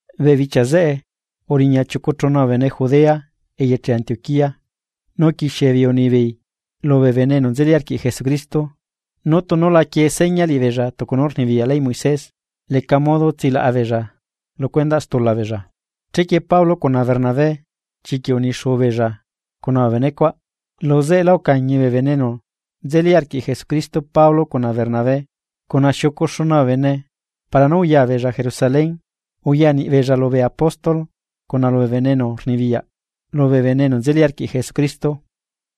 Bee bichia zeꞌe uriña chiucu chuna bee bene Judea eyeche Antioquía. Nu uquixiebeei unibeei lubee bene enu nzeli arquiꞌ Jesucristo nú tunu la quie seña liꞌibeella tucu nú rnibiyaꞌ leyꞌ Moisés leca modo tsilaꞌa beella lu cuendaꞌ stula beella. Chequie Pablo cuna Bernabé chiquiꞌ unixuu beella cuna bee benecuaꞌ, luzeꞌelá ucañi bee bene enu nzeli arquiꞌ Jesucristo Pablo cuna Bernabé cuna xiucu xuna bee bene para nú uya beella Jerusalén, uya niꞌi beella lubee apóstol cuna lubee bene enu rnibiyaꞌ lubee bene enu nzeli arquiꞌ Jesucristo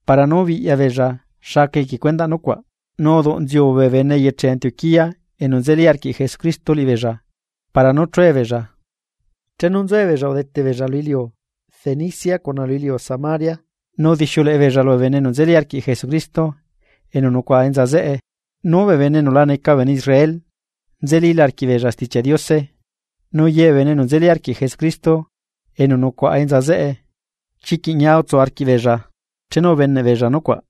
para nú biꞌya beella xa aca equie cuendaꞌ nucuaꞌ. Nu uduꞌnziu bee bene eyeche Antioquía enu nzeli arquiꞌ Jesucristo liꞌibeella para nú chue beella. Chenu nzuebeella udete beella lu iliu Fenicia cuna lu iliu Samaria, nu udixiuleꞌe beella lubee bene enu nzeli arquiꞌ Jesucristo enu nucuaꞌa enza zeꞌe. Nu bee bene enu la neca bee bene Israel nzelila arquiꞌbeella Stichiaꞌ Diose. Nu ye bee bene enu nzeli arquiꞌ Jesucristo enu nucuaꞌa enza zeꞌe, chiquiꞌ ñia utsu arquiꞌbeella chenu ubeneꞌbeella nucuaꞌ.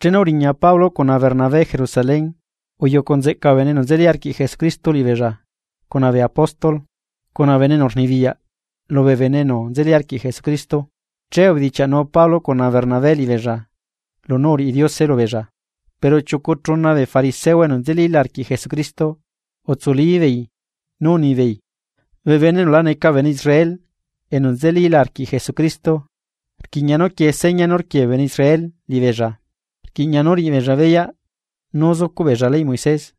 Chenu uriña Pablo cuna bernabé Jerusalén, uyucu nzeꞌca bee bene enu nzeli arquiꞌ Jesucristo liꞌibeella cuna bee apóstol cuna bee bene enu rnibiyaꞌ lubee bene enu nzeli arquiꞌ Jesucristo, che ubedichiaꞌnu Pablo cuna Bernabé liꞌibeella lunú uriꞌi Diose lubeella. Pero chiucu chuna bee fariseo enu nzelíla arquiꞌ Jesucristo, utsulíbeei nú unibeei: ―Bee bene enu la neca bee bene Israel enu nzelíla arquiꞌ Jesucristo rquiꞌña nú quiee seña nú rquie bee bene Israel liꞌibeella, nu rquiꞌña nú riꞌibeella beyaꞌ nú zucuꞌ beella leyꞌ Moisés.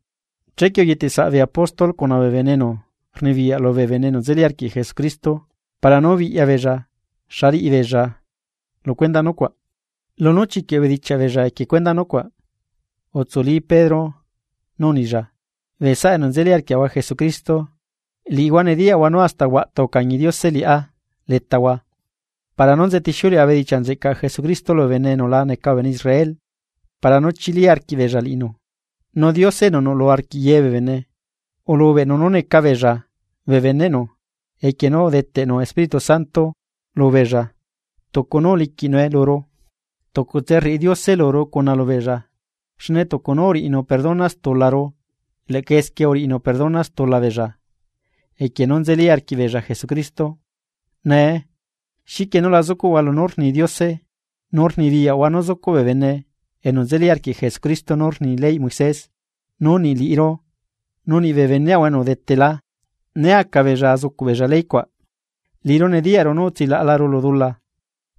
Chequie uyetesaꞌ bee apóstol cuna bee bene enu rnibiyaꞌ lubee bene enu nzeli arquiꞌ Jesucristo para nú biꞌya beella xa riꞌibeella lu cuendaꞌ nucuaꞌ. Lunú chiquiꞌ ubedichiaꞌ beella equie cuendaꞌ nucuaꞌ, utsuli Pedro nu unilla: ―Bee saꞌa enu nzeli arquiaꞌahua Jesucristo, liꞌihua nediyaꞌhua nú hasta huaꞌtu ucañi Diose liꞌá letahua para nú nzetixiuleꞌa bedichiaꞌ nzeꞌcaꞌ Jesucristo lubee bene enu la neca bee bene Israel para nú chili arquiꞌbeella liꞌinu. Nu Diose enu nuꞌlu arquiꞌ ye bee bene, ulubeꞌnu nú neca beella bee beneꞌnu equie nú udeteꞌnu Espíritu Santo lubeella tucu nú uliquiꞌnue luru, tucutse rriꞌi Diose luru cuna lubeella, xne tucu nú uriꞌinu perdona stularu leꞌca esquie uriꞌinu perdona stula beella equie nú nzeli arquiꞌbeella Jesucristo. Nee, ¿xiquie nú la zucuꞌhua lunú rni Diose nu rnibiyaꞌhua nú zucuꞌ bee bene enu nzeli arquiꞌ Jesucristo nú rni leyꞌ Moisés, nu niꞌ liꞌiru nu niꞌbee beneaꞌahua enu udetela, né aca beella azucuꞌbeella ley cuaꞌ? Liꞌiru nediyaꞌru nú utsilaꞌalaru lu dula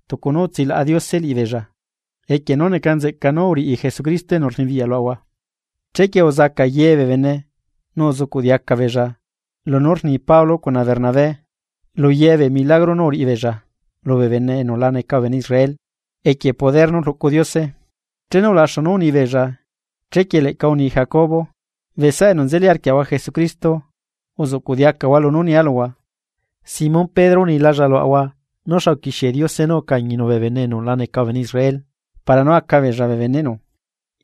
tucu nú utsilaꞌa Diose liꞌibeella, equie nú neca nzeꞌca nú uriꞌi Jesucristo enu rnibiyaꞌ luaꞌahua. Chequie uzaca ye beella nu uzucuꞌ diaca beella lunú rni Pablo cuna Bernabé lu ye bee milagro nú uriꞌibeella lubee bene enu la neca bee bene Israel, equie poder nú rluꞌcu Diose. Chenu ulaxu nú unibeella, chequie leꞌca uni Jacobo: ―Bee saꞌa enu nzeli arquiaꞌahua Jesucristo, uzucuꞌ diacahua lunú nialuhua. Simón Pedro unilalla luaꞌahua nú xa uquixie Diose nú ucañinu bee bene enu la neca bee bene Israel para nú aca beella bee beneꞌnu.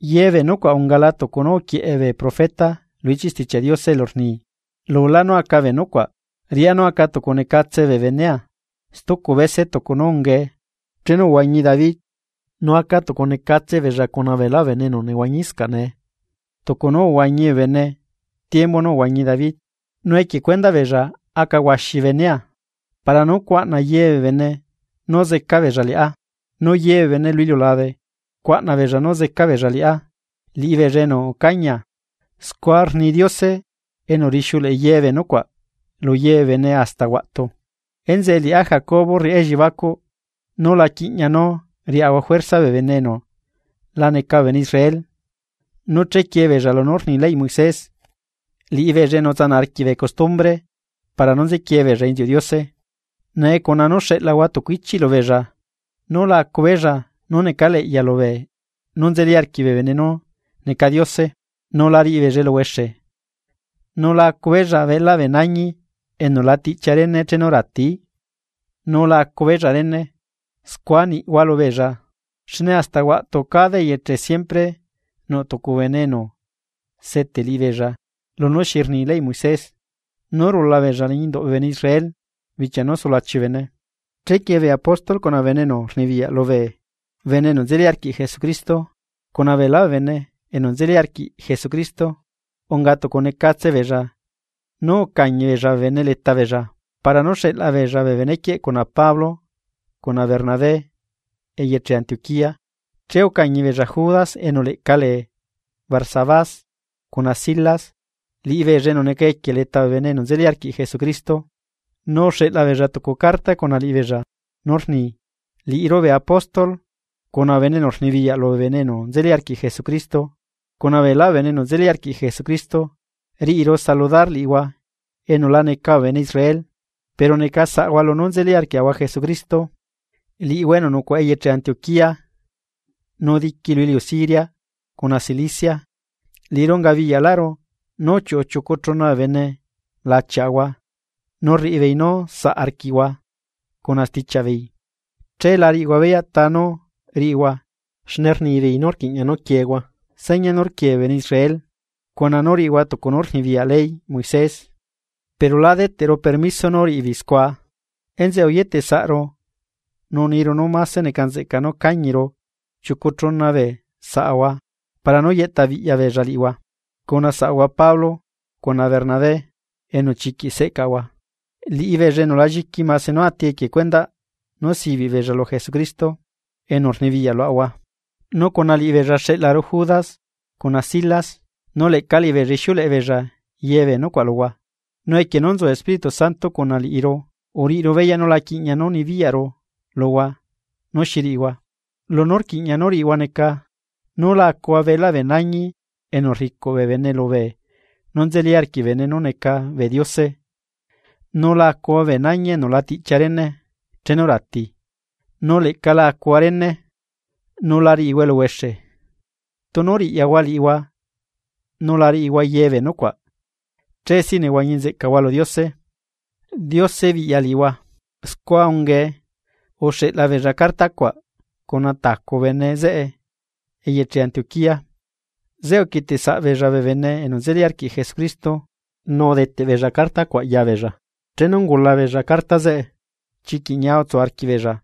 Ye bee nucuaꞌ ungala tucu nú uquieꞌe bee profeta lu ichiꞌ Stichiaꞌ Diose elu rni: Lulá nú aca bee nucuaꞌ, riꞌá nú aca tucu necatse bee benea stucu bese tucu nú ungae chenu uhuañi David. Nu aca tucu necatse beella cuna beelá bee bene enu nehuañiscaꞌ nee, tucu nú uhuañi bee bene tiembu nú uhuañi David, nu equie cuendaꞌ beella aca huaxi bee benea, para nú cuaꞌna ye bee bene nú zeca beella liꞌá, nu ye bee bene lu iliulabe cuaꞌna beella nú zeca beella liꞌá, liꞌibeella enu ucañia. Scua rni Diose enu rixiuleꞌe ye bee nucuaꞌ lu ye bee bene hasta huaꞌtu. ’Enzeꞌe liꞌá Jacobo rriꞌá elliebacuꞌ nú la quiꞌña nú riaꞌahua juerza bee bene enu la neca bee bene Israel nú chequie beella lunú rni leyꞌ Moisés, liꞌibeella enu utsanaꞌ arquiꞌ bee custumbre para nú nzequie beella inziuꞌ Diose. Nee neca nzeꞌca nú xeꞌlahua tucu ichiꞌ lubeella nú la acu beella nú necaleꞌya lubee nú nzeli arquiꞌ bee bene nú neca diose, nu la riꞌibeella eluhuexe nu la acu beella beꞌlaꞌ bee nañi enu la tiꞌchia rene chenu rati, nu la acu beella rene. Scua niaꞌahua lubeella, xne hasta huaꞌtu cada eyeche siempre nuꞌ tucu bene enu seteꞌ liꞌibeella lunú xi rni leyꞌ Moisés nú rula beella liñi induꞌ bee bene Israel bichia nú sulachi bee bene. Chequie bee apóstol cuna bee bene enu rnibiyaꞌ lubee bene enu nzeli arquiꞌ Jesucristo, cuna ye beelá bee bene enu nzeli arquiꞌ Jesucristo unga tucunecatse beella nú ucañi beella bee bene leta beella para nú xeꞌla beella bee benequieꞌ cuna Pablo cuna Bernabé eyeche Antioquía. Che ucañi beella Judas enu leꞌca lee Barsabás, cuna Silas, liꞌibeella enu neca equie leta bee bene enu nzeli arquiꞌ Jesucristo. Nu uxeꞌla beella tucu carta cuna liꞌibeella nú rni: “Liꞌiru bee apóstol, cuna bee bene enu rnibiyaꞌ lubee bene enu nzeli arquiꞌ Jesucristo, cuna beela bee bene enu nzeli arquiꞌ Jesucristo, riꞌiru saludar liꞌihua enu la neca bee bene Israel, pero neca saꞌahua lunú nzeli arquiaꞌahua Jesucristo, liꞌihua enu nucuaꞌa eyeche Antioquía, nu diqui lu iliu Siria, cuna Cilicia. Liꞌiru ungabiyaꞌlaꞌru nú uchiuꞌu chiucu chuna bee bene lachiaꞌahua nu rriꞌibeei nú saꞌ arquiꞌhua cuna stichiaꞌ beei, che la riꞌihua beyaꞌ ta nú riꞌihua xne rnibeei nú rquiꞌña nú quiehua seña nú rquie bee bene Israel, cuna nú riꞌihua tucu nú rnibiyaꞌ leyꞌ Moisés pero lá deteꞌru permiso nú riꞌibeei scua. Enzeꞌe uyetesaꞌru nu uniru nú máse neca nzeꞌca nú cañiru chiucu chuna bee saꞌahua para nú yeꞌta biꞌya beella liꞌihua, cuna saꞌahua Pablo cuna Bernabé enu chiquiꞌ seꞌcaꞌahua, liꞌibeella enu la lliqui mase nú ati equie cuendaꞌ nú sibiꞌ beella lu Jesucristo enu rnibiyaꞌ luaꞌahua. Nu cuna liꞌibeella xeꞌlaru Judas cuna Silas, nu leꞌca liꞌibeella ixiuleꞌe beella ye bee nucuaꞌ luhua. Nu equie nú nzu Espíritu Santo cuna liꞌiru, uriꞌiru beyaꞌ nú la quiꞌña nú nibiyaꞌru luhua nú xi riꞌihua, lunú rquiꞌña nú riꞌihua neca, nú la acuhua beꞌlaꞌ bee nañi enu rricuꞌ bee bene lubee nú nzeli arquiꞌ bee bene nú neca bee diose, nu la acuhua bee nañi enu la tiꞌchia rene chenu rati nu leꞌca la acuhua rene nu la riꞌihua eluhuexe. Tunu riꞌyahua liꞌihua nú la riꞌihua ye bee nucuaꞌ che sí nehuañi nzeꞌcahua lu Diose. Diose biꞌya liꞌihua.” Scua ungae, uxeꞌla beella carta cuaꞌ cuna tacu bene zeꞌe eyeche Antioquía. Zeꞌe uquieteꞌsaꞌbeella bee bene enu nzeli arquiꞌ Jesucristo nu udeteꞌ beella carta cuaꞌ ya beella. Chenu ungula beella carta zeꞌe, chiquiꞌ ñia utsu arquiꞌbeella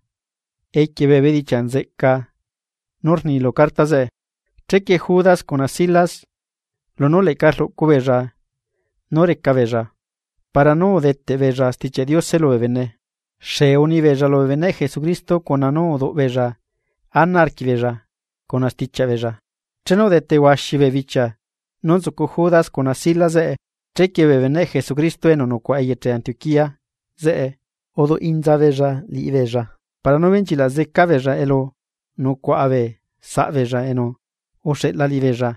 equie bee bedichiaꞌ nzeꞌca nú rni lu carta zeꞌe. Chequie Judas cuna Silas lunú leꞌca rluꞌcu beella nú reca beella para nú udeteꞌ beella Stichiaꞌ Diose lubee bene, xee unibeella lubee beneꞌ Jesucristo cuna nú uduꞌ beella ana arquiꞌbeella cuna stichiaꞌ beella. Chenu udete huaxi bee bichia nú nzucu Judas cuna Silas zeꞌe, chequie bee beneꞌ Jesucristo enu nucuaꞌa eyeche Antioquía zeꞌe uduꞌ inza beella liꞌibeella para nú benchilaꞌ zeca beella elu nucuaꞌa bee saꞌbeella enu uxeꞌla liꞌibeella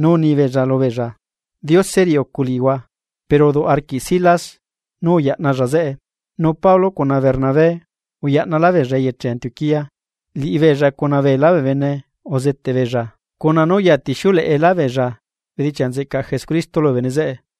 nú unibeella lubeella: “Diose riꞌi ucu liꞌihua.” Pero uduꞌ arquiꞌ Silas nú uyaꞌnalla zeꞌe Nu Pablo cuna Bernabé uyaꞌnalá beella eyeche Antioquía, liꞌibeella cuna beelá bee bene uzeteꞌ beella, cuna nú uyatixiuleꞌe beella bedichia nzeꞌcaꞌ Jesucristo lubee bene zeꞌe.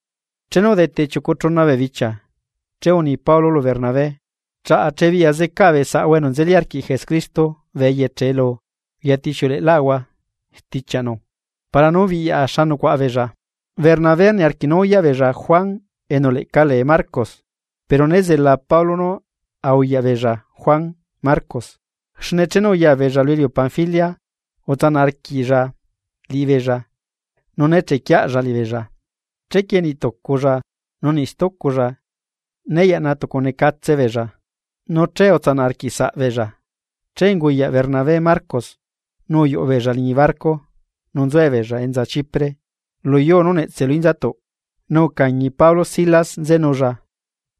Chenu udete chiucu chuna bee bichia, che uni Pablo lu Bernabé: ―Chaꞌa chebiꞌyaꞌ zecaꞌa bee saꞌahua enu nzeli arquiꞌ Jesucristo bee eyeche elu uyatixiuleꞌe lá stichiaꞌnu para nú biꞌyaꞌa xa nucuaꞌa beella. Bernabé niarquiꞌ nú uyaꞌ beella Juan enu leꞌca lee Marcos; pero nézela Pablo nú a uyaꞌ beella Juan Marcos, xne chenu uya beella lu iliu Panfilia utsanaꞌ arquiꞌlla liꞌibeella nu né chequiella liꞌibeella. Chequie niꞌ tuculla nu niꞌ stuculla né yaꞌna tucu necatse beella, nu utsanaꞌ arquiꞌsaꞌbeella. Che unguyaꞌ Bernabé Marcos nu uyuꞌu beella liñi barco nu nzuebeella enza Chipre luyuu nú netse lu inzatuꞌ. Nu ucañi Pablo Silas nzenulla,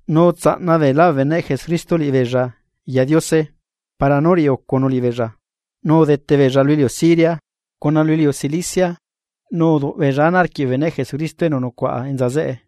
nu utsaꞌna beelá bee beneꞌ Jesucristo liꞌibeella ya Diose para nú riꞌiucunu liꞌibeella. Nu udete beella lu iliu Siria, cuna lu iliu Cilicia nu uduꞌ beella ana arquiꞌ bee beneꞌ Jesucristo enu nucuaꞌa enza zeꞌe.